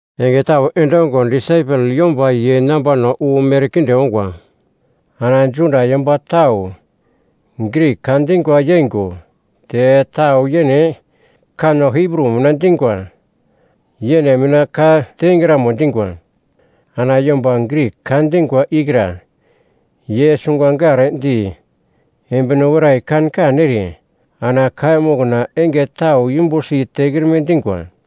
Enge tau endongo disaipel yomba ye nambano wu merkinde ongwa. Ana Juda yomba tau Grik ka dingwa yeingo te tau yene kanno Hibru mina dingwa, yene mina ka tengramo dingwa. Ana yomba Grik ka dingwa ikra ye sungangardi embino werai kan kan ere ana kaiya mokna enge tau yumbusi tekrime dingwa.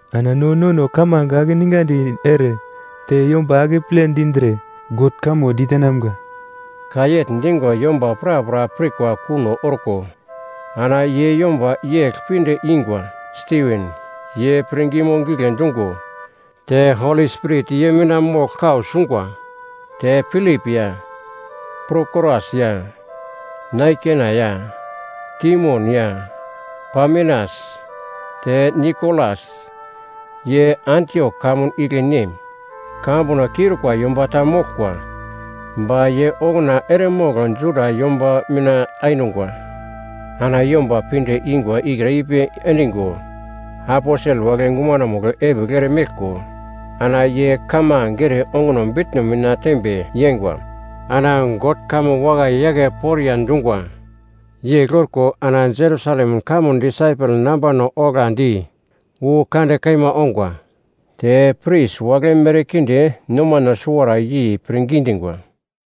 Ana no nono kamange akeningandi ere te yomba akeple dindre God kamo ditenamga.” Ka yegl dingo yomba prapra pirkwa kuno orko ana ye yomba yegl pinde ingwa: Stiven, ye pirngimo gigle dungo te Holi Spirit ye mina mogl kau sungwa, te Pilip ya, Prokoras ya, Naikena ya, Timon ya, Pamenas, te Nikolas, ye Antiok kamun igle nem, kamambuno kiurikwa yomba ta moglkwa ba ye okuna eremogl Juda yomba mina ainungwa. Ana yomba pinde ingwa ikra ipi endingo aposel wagle gumanomugl epigl eremeglko ana ye kamange ere onguno bitno mina tembe yeingwa. Ana God kamo wakai yake poriya dungwa. Yegl orko ana Jerusalem kamun disaipel nambano oglandi wu kande kaima ongwa. Te pris wagle merkinde nomano suwara yei pirngi dingwa.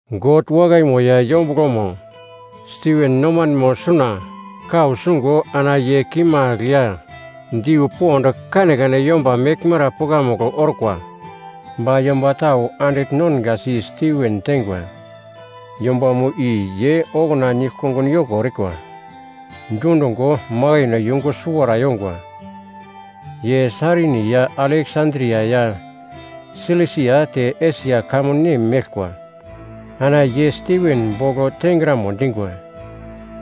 God wakaimo ya yombuglomo Stiven nomanemo suna kau sungo ana ye kimagl ya diu pond kanekane yomba meglmara pukamugl orkwa. Ba yomba tau andigl nongasi Stiven teingwa. Yombamo i ye okuna nigl-kongun yoko erikwa dundungo makaino yungu suwara yongwa. Ye Sairini ya Aleksandria ya Silisia te Esia kamun nem meglkwa. Ana ye Stiven bogl tengramo dingwa.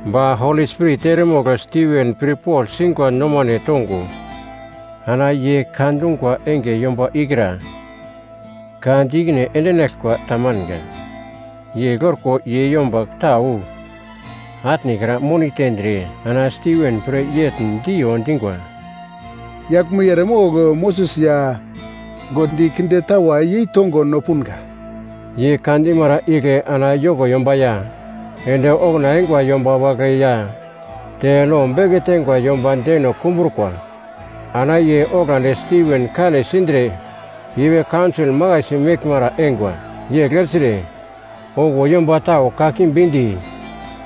Ba Holi Spirit eremogl Stiven pirpogl singwa nomane tongo ana ye ka dungwa enge yomba ikra ka di ikine endinaglkwa ta manga. Yegl orko ye yomba tau atnekra moni tendre ana Stiven pre yegl diyo dingwa, “Yaglmo i eremogl Moses ya God di kinde tawa yeitongo no punga!” Ye ka dimara igle ana yoko yomba ya, ende okuna eingwa yomba wagle ya, te lo beke teingwa yomba deno kumbrukwa. Ana ye oglandi Stiven kane sindre ipi kaunsol makaisi meglmara eingwa. Yegl ertre, okuwo yomba tau kakimbi di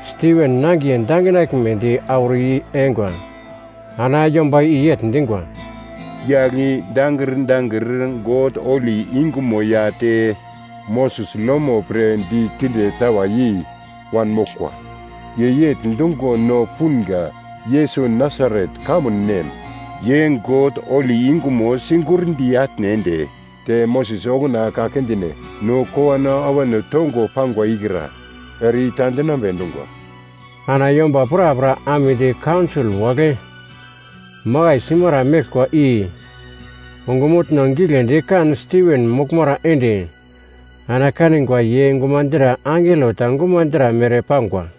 Stiven nangiye danginaglmedi auro i-yengwa. Ana yomba i yegl dingwa, “Yagl i dangir dangir God holi yungumo ya te Moses lomo pre di kinde tawa yei wanmoglkwa”. Ye yegl dungo no punga, “Yesus Nasaret kamun nem, ye God holi yungumo sigurndi atne ende, te Moses okuna ka kindine no kowano awano tongo pangwa ikra ere ita endinambe dungwa.” Ana yomba prapra amedi kaunsol wagle makai simara meglkwa i ongumutno giglendi kan Stiven moglmara ende ana kanigwa ye gumadra angelo ta gumadra mere pangwa.